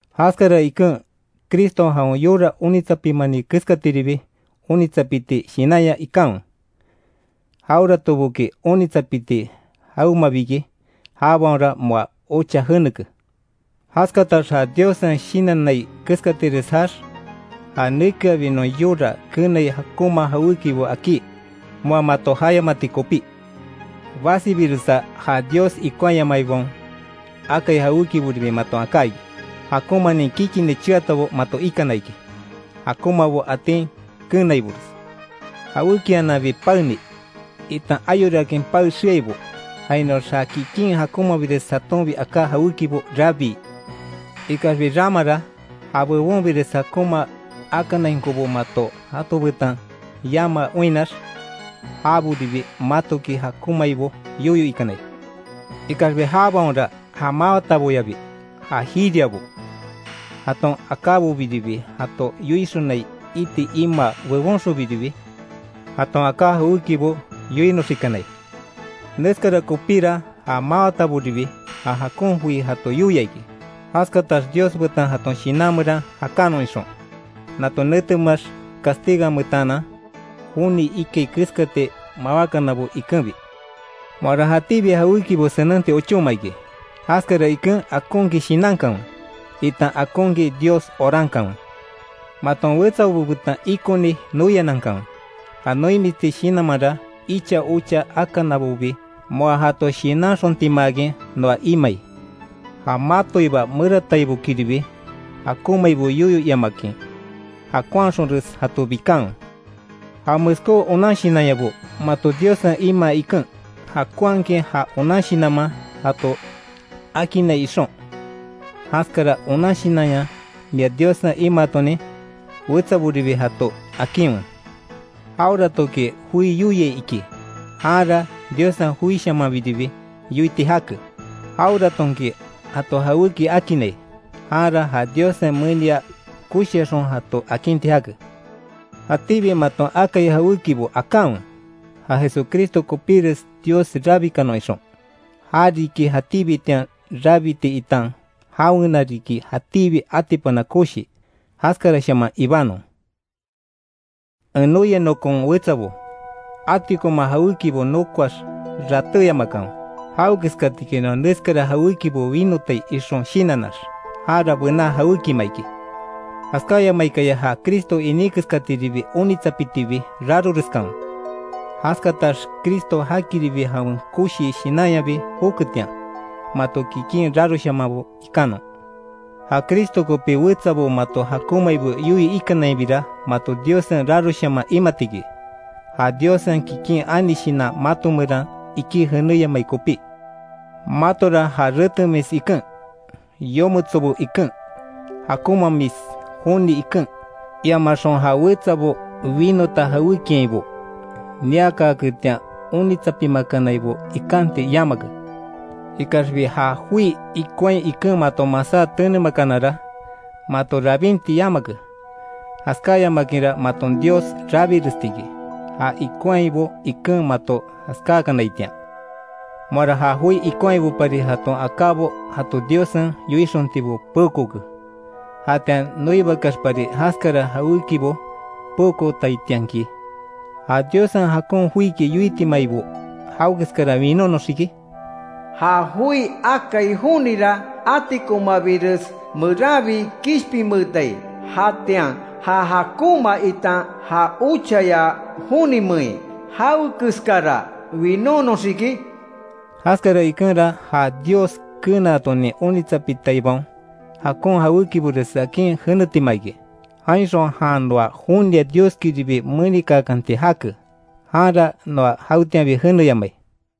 Jaskara iken, Criston jawen yora onitsapimani keskatiribi onitsapiti shinanya ikanwe. Jaweratoboki onitsapiti jawemabi iki, jabaonra moa ocha jeneke. Jaskatax ja Diossen shinannai keskatires jaax, ja nekeabi non yora keenai jakonma jawékibo akí, moa mato jayamati kopí. Basibiresa ja Dios ikonhayamaibaon akai jawékiboribi maton aká iki, jakonmanin kikini cheatabo mato ikana iki, jakonmabo atin keenaibores; jawékiananbi paeni, itan ayorakin pae xeaibo; jainoax ja kikin jakonmabires jatonbi aká jawékibo rabii. Ikaxbi ramara, ja bebonbires jakonma akanainkobo mato jato betan yamaa oinnax, jabobiribi matoki jakonmaibo yoyo ikanai. Ikaxbi jabaonra ja mawataboyabi ja jiriabo, jaton akábobiribi jato yoixonai iti imaa bebonxonbiribi, jaton aká jawékibo yoinoxikanai. Neskara kopíra ja mawataboribi ja jakon joi jato yoia iki, jaskatax Dios betan jaton shinan meran jakanon ixon; nato netemeax castiganmetaanan, joni ikai keskati mawákanabo ikenbi. Moara jatíbi jawékibo senenti ochóma iki; jaskara iken akonkin shinankanwe, itan akonkin Dios orankanwe. Maton wetsabo betan ikoni noianankanwe, ja noimisti shinanmanra icha ocha akanabobi moa jato shinanxontimaakin noa imai. Ja matoiba merataibokiribi jakonmaibo yoyo iamakin, jakonhaxonres jato bikanwe. Ja meskó onan shinanyabo mato Diossen imaa iken, jakonhakin ja onan shinanman jato akinnai ixon, jaskara onan shinanya mia Diossen imaatonin, wetsaboribi jato akinwe. Jaweratoki joi yoiai iki, janra Diossen joishamanbiribi yoiti jake; jaweratonki jato jawéki akinnai, janra ja Diossen menia koshiaxon jato akinti jake. Jatíbi maton akai jawékibo akanwe, ja Jesucristo kopíres Dios rabikanon ixon; ja riki jatíbitian rabiti itan jawena riki jatíbi atipana koshi. Jaskarashaman ibanon. En noia nokon wetsabo, atikoma jawékibo nokoax ratéyamakanwe; jawekeskatiki noa neskara jawékibo winotai ixon shinannax, jara bená jawékima iki. Jaskáyamaikaya ja Cristo iní keskatiribi onitsapitibi raroreskanwe, jaskatax Cristo jakiribi jawen koshi shinanyabi joketian, mato kikin raroshamanbo ikanon. Ja Cristo kopí wetsabo mato jakomaibo yoyo ikanainbira mato Diossen raroshaman imati iki, ja Diossen kikin ani Shinan mato meran ikí jenéyamai kopí. Matora ja retemis iken, yometso iken, jakonmaamis joni iken, iamaxon ja wetsabo winota jawékiainbo niakaaketian onitsapimakanaibo ikanti yamake. Ikaxbi ja joi ikonhai iken mato masá tenemakanara, mato rabinti yamake, jaskáyamakinra maton Dios rabiresti iki, ja ikonhaibo iken mato jaskákanaitian. Moara ja joi ikonhaibopari jaton akábo jato Diossen yoixontibo peokooke, jatian noibakeaxpari jaskara jawékibo peokootaitianki, ¿Ja Diossen jakon joiki yoitimaibo jawekeskara winónoxiki? Ja joi akai jonira atikonmabires meranbi kishpinmeetai, jatian ¿Ja jakonma itan ja ochaya jonimein, jawekeskara winónoxiki? Jaskara ikenra ja Dios keenaton onitsapitaibaon, jakon jawékibores akin jenetima iki, jainxon jan noa jonia Dioskiribi menikaakanti jake, janra noa jawetianbi jeneyamai.